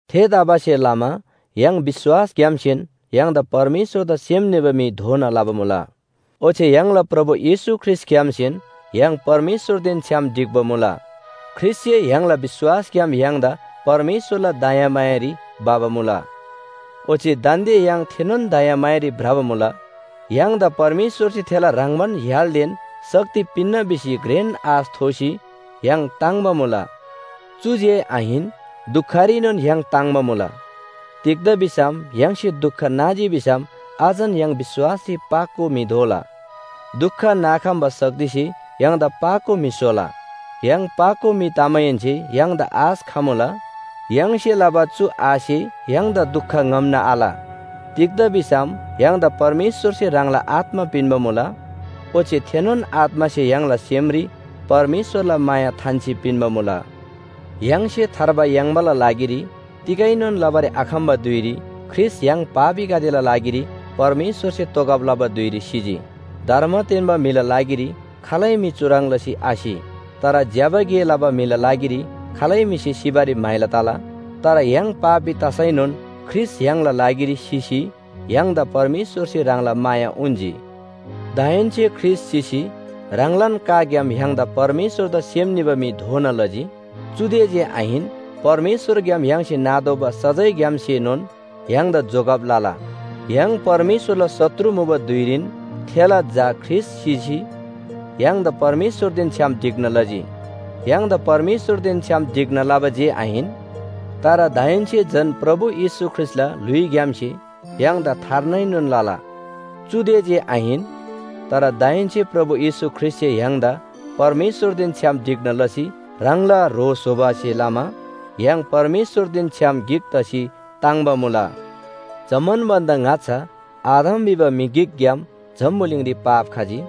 थेतबासेलमा य्‍हाङला विश्‍वासग्‍यामसेन य्‍हाङदा परमेश्‍वरदा सेम निबा म्‍हि दोना लबा मुला। ओच्‍छे य्‍हाङला प्रभु येशू ख्रीष्‍टग्‍यामसेन य्‍हाङ परमेश्‍वरदेन छ्‌याम ढिक्‍बा मुला। ख्रीष्‍टसे य्‍हाङला विश्‍वासग्‍याम य्‍हाङदा परमेश्‍वरला दयामायारी भबा मुला। ओच्‍छे दान्‍दे य्‍हाङ थेनोन दयामायारी भ्रबा मुला। य्‍हाङदा परमेश्‍वरसे थेला ह्रङ्‌बान य्‍हालदेन शक्ति पिन्‍ना भिसी घ्रेन आश थोसी य्‍हाङ ताङ्‍बा मुला। चुदे जे आहिन, दुखरीनोन य्‍हाङ ताङ्‍बा मुला। तिग्‍दा भिसम य्‍हाङसे दुख नाजी भिसम अझन य्‍हाङ विश्‍वासरी पाको म्‍हि दोला। दुख नाखम्‍बा शक्तिसे य्‍हाङदा पाको म्‍हि स्‍होला। य्‍हाङ पाको म्‍हि तमाहेन्‍से य्‍हाङदा आश खमुला। य्‍हाङसे लबा चु आशसे य्‍हाङदा दुख ङ्‍हम्‍ना आल। तिग्‍दा भिसम य्‍हाङदा परमेश्‍वरसे ह्राङला आत्‍मा पिन्‍बा मुला, ओच्‍छे थेनोन आत्‍मासे य्‍हाङला सेमरी परमेश्‍वरला माया थान्‍सी पिन्‍बा मुला। य्‍हाङसे थार्बा याङ्बाला लागिरी तिगैनोन लबारी आखम्‍बा धुइरी ख्रीष्‍ट य्‍हाङ पापीगदेला लागिरी परमेश्‍वरसे तोगब लबा धुइरी सिजी। धर्म तेन्‍बा म्‍हिला लागिरी खालै म्‍हि चुह्रङ् लसी आसि। तर ज्‍यबा गे लबा म्‍हिला लागिरी खालै म्‍हिसे सिबारी म्‍हाइला तला। तर य्‍हाङ पापी तसैनोन ख्रीष्‍ट य्‍हाङला लागिरी सिसी य्‍हाङदा परमेश्‍वरसे ह्राङला माया उन्‍जी। दाहेन्‍से ख्रीष्‍ट सिसी ह्राङलान काग्‍याम य्‍हाङदा परमेश्‍वरदा सेम निबा म्‍हि दोना लजी। चुदे जे आहिन, परमेश्‍वरग्‍याम य्‍हाङसे नातोःबा सजायग्‍यामसेनोन य्‍हाङदा जोगब लला। य्‍हाङ परमेश्‍वरला शत्रु मुबा धुइरीन थेला झा ख्रीष्‍ट सिसी य्‍हाङदा परमेश्‍वरदेन छ्‌याम ढिक्‍ना लजी। य्‍हाङदा परमेश्‍वरदेन छ्‌याम ढिक्‍ना लबा जे आहिन, तर दाहेन्‍से झन प्रभु येशू ख्रीष्‍टला ल्‍हुइग्‍यामसे य्‍हाङदा थार्नाएनोन लला। चुदे जे आहिन, तर दाहेन्‍से प्रभु येशू ख्रीष्‍टसे य्‍हाङदा परमेश्‍वरदेन छ्‌याम ढिक्‍ना लसी ह्राङला ह्रो स्‍होबासे लमा य्‍हाङ परमेश्‍वरदेन छ्‌याम गिक तसी ताङ्‍बा मुला। जम्‍मान भन्‍दा ङाच्‍छा आदम भिबा म्‍हि गिकग्‍याम जम्‍बुलिङरी पाप खजी,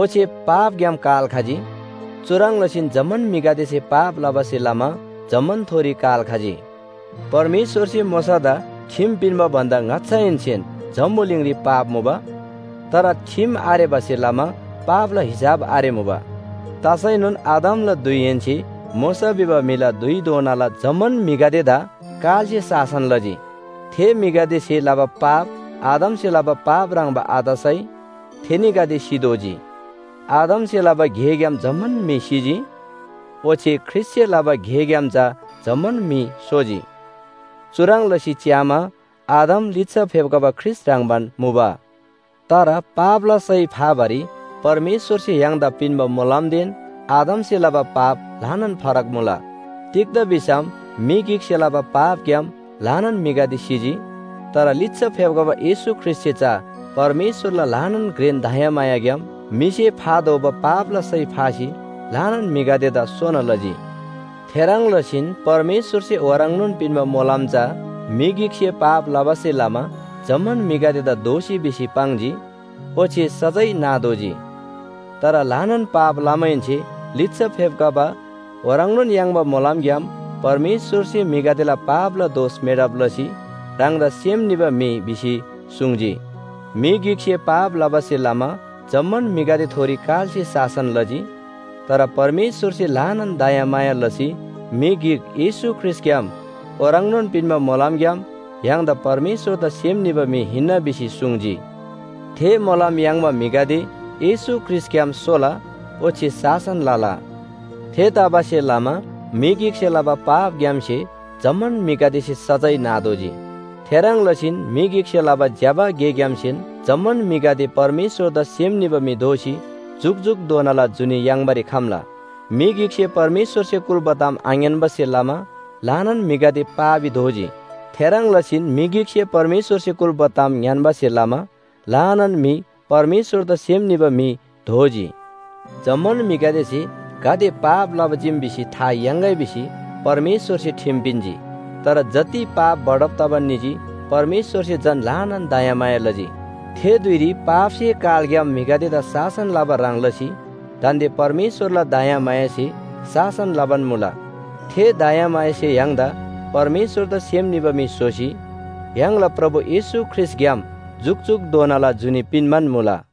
ओच्‍छे पापग्‍याम काल खजी। चुह्रङ् लसीन जम्‍मान म्‍हिगदेसे पाप लबासे लमा जम्‍मानथोरी काल खजी। परमेश्‍वरसे मोशादा ठिम पिन्‍बा भन्‍दा ङाच्‍छाहेन्‍सेन जम्‍बुलिङरी पाप मुबा। तर ठिम आरेबासे लमा पापला हिसाब आरेमुबा। तसैनोन आदमला धुइहेन्‍से मोशा भिबा म्‍हिला धुइधोनाला जम्‍मान म्‍हिगदेदा कालसे शासन लजी। थे म्‍हिगदेसे लबा पाप आदमसे लबा पाप ह्रङ्‌बा आतसै थेनीगदे सितोःजी। आदमसे लबा गेग्‍याम जम्‍मान म्‍हि सिजी, ओच्‍छे ख्रीष्‍टसे लबा गेग्‍याम चा जम्‍मान म्‍हि सोजी। चुह्रङ् लसी च्‍यामा, आदम लिच्‍छा फेप्‍खबा ख्रीष्‍ट ह्रङ्‌बान मुबा। तर पापला सय फाबारी परमेश्‍वरसे य्‍हाङदा पिन्‍बा मोलमदेन आदमसे लबा पाप ल्‍हानान फरक मुला। तिग्‍दा भिसम म्‍हि गिकसे लबा पापग्‍याम ल्‍हानान म्‍हिगदे सिजी। तर लिच्‍छा फेप्‍खबा येशू ख्रीष्‍टसे चा परमेश्‍वरला ल्‍हानान घ्रेन दयामायाग्‍याम म्‍हिसे फातोःबा पापला सय फासी ल्‍हानान म्‍हिगदेदा सोना लजी। थेह्रङ् लसीन परमेश्‍वरसे ओह्रङ्नोन पिन्‍बा मोलम चा म्‍हि गिकसे लबा पाप भन्‍दा फरक मुला। म्‍हि गिकसे पाप लबासे लमा जम्‍मान म्‍हिगदेदा दोषी भिसी पाङ्जी, ओच्‍छे सजाय नातोःजी। तर ल्‍हानान पाप लमाहेन्‍से लिच्‍छा फेप्‍खबा ओह्रङ्नोन याङ्बा मोलमग्‍याम परमेश्‍वरसे म्‍हिगदेला पापला दोष मेटब लसी ह्राङदा सेम निबा म्‍हि भिसी सुङ्जी। म्‍हि गिकसे पाप लबासे लमा जम्‍मान म्‍हिगदेथोरी कालसे शासन लजी। तर परमेश्‍वरसे ल्‍हानान दयामाया लसी म्‍हि गिक येशू ख्रीष्‍टग्‍याम ओह्रङ्नोन पिन्‍बा मोलमग्‍याम य्‍हाङदा परमेश्‍वरदा सेम निबा म्‍हि हिन्‍ना भिसी सुङ्जी। थे मोलम याङ्बा म्‍हिगदे येशू ख्रीष्‍टग्‍याम सोला ओच्‍छे शासन लला। थेतबासेलमा म्‍हि गिकसे लबा पापग्‍यामसे जम्‍मान म्‍हिगदेसे सजाय नातोःजी, थेह्रङ् लसीन म्‍हि गिकसे लबा ज्‍यबा गेग्‍यामसेन जम्‍मान म्‍हिगदे परमेश्‍वरदा सेम निबा म्‍हि दोसी जुकजुकधोनाला जुनी याङ्बारी खम्‍ला। म्‍हि गिकसे परमेश्‍वरसे कुल्‍बा ताम आङ्‌यान्‍बासे लमा ल्‍हानान म्‍हिगदे पापी दोजी। थेह्रङ् लसीन म्‍हि गिकसे परमेश्‍वरसे कुल्‍बा ताम ङ्‌यान्‍बासे लमा ल्‍हानान म्‍हि परमेश्‍वरदा सेम निबा म्‍हि दोजी। जम्‍मान म्‍हिगदेसे गाते पाप लबा चीम भिसी था याङ्‌गै भिसी परमेश्‍वरसे ठिम पिन्‍जी। तर जति पाप बढब तबान निजी परमेश्‍वरसे झन ल्‍हानान दयामाया लजी। थे धुइरी पापसे कालग्‍याम म्‍हिगदेदा शासन लबा ह्रङ् लसी दान्‍दे परमेश्‍वरला दयामायासे शासन लबान मुला। थे दयामायासे य्‍हाङदा परमेश्‍वरदा सेम निबा म्‍हि स्‍होसी य्‍हाङला प्रभु येशू ख्रीष्‍टग्‍याम जुकजुकधोनाला जुनी पिन्‍बान मुला।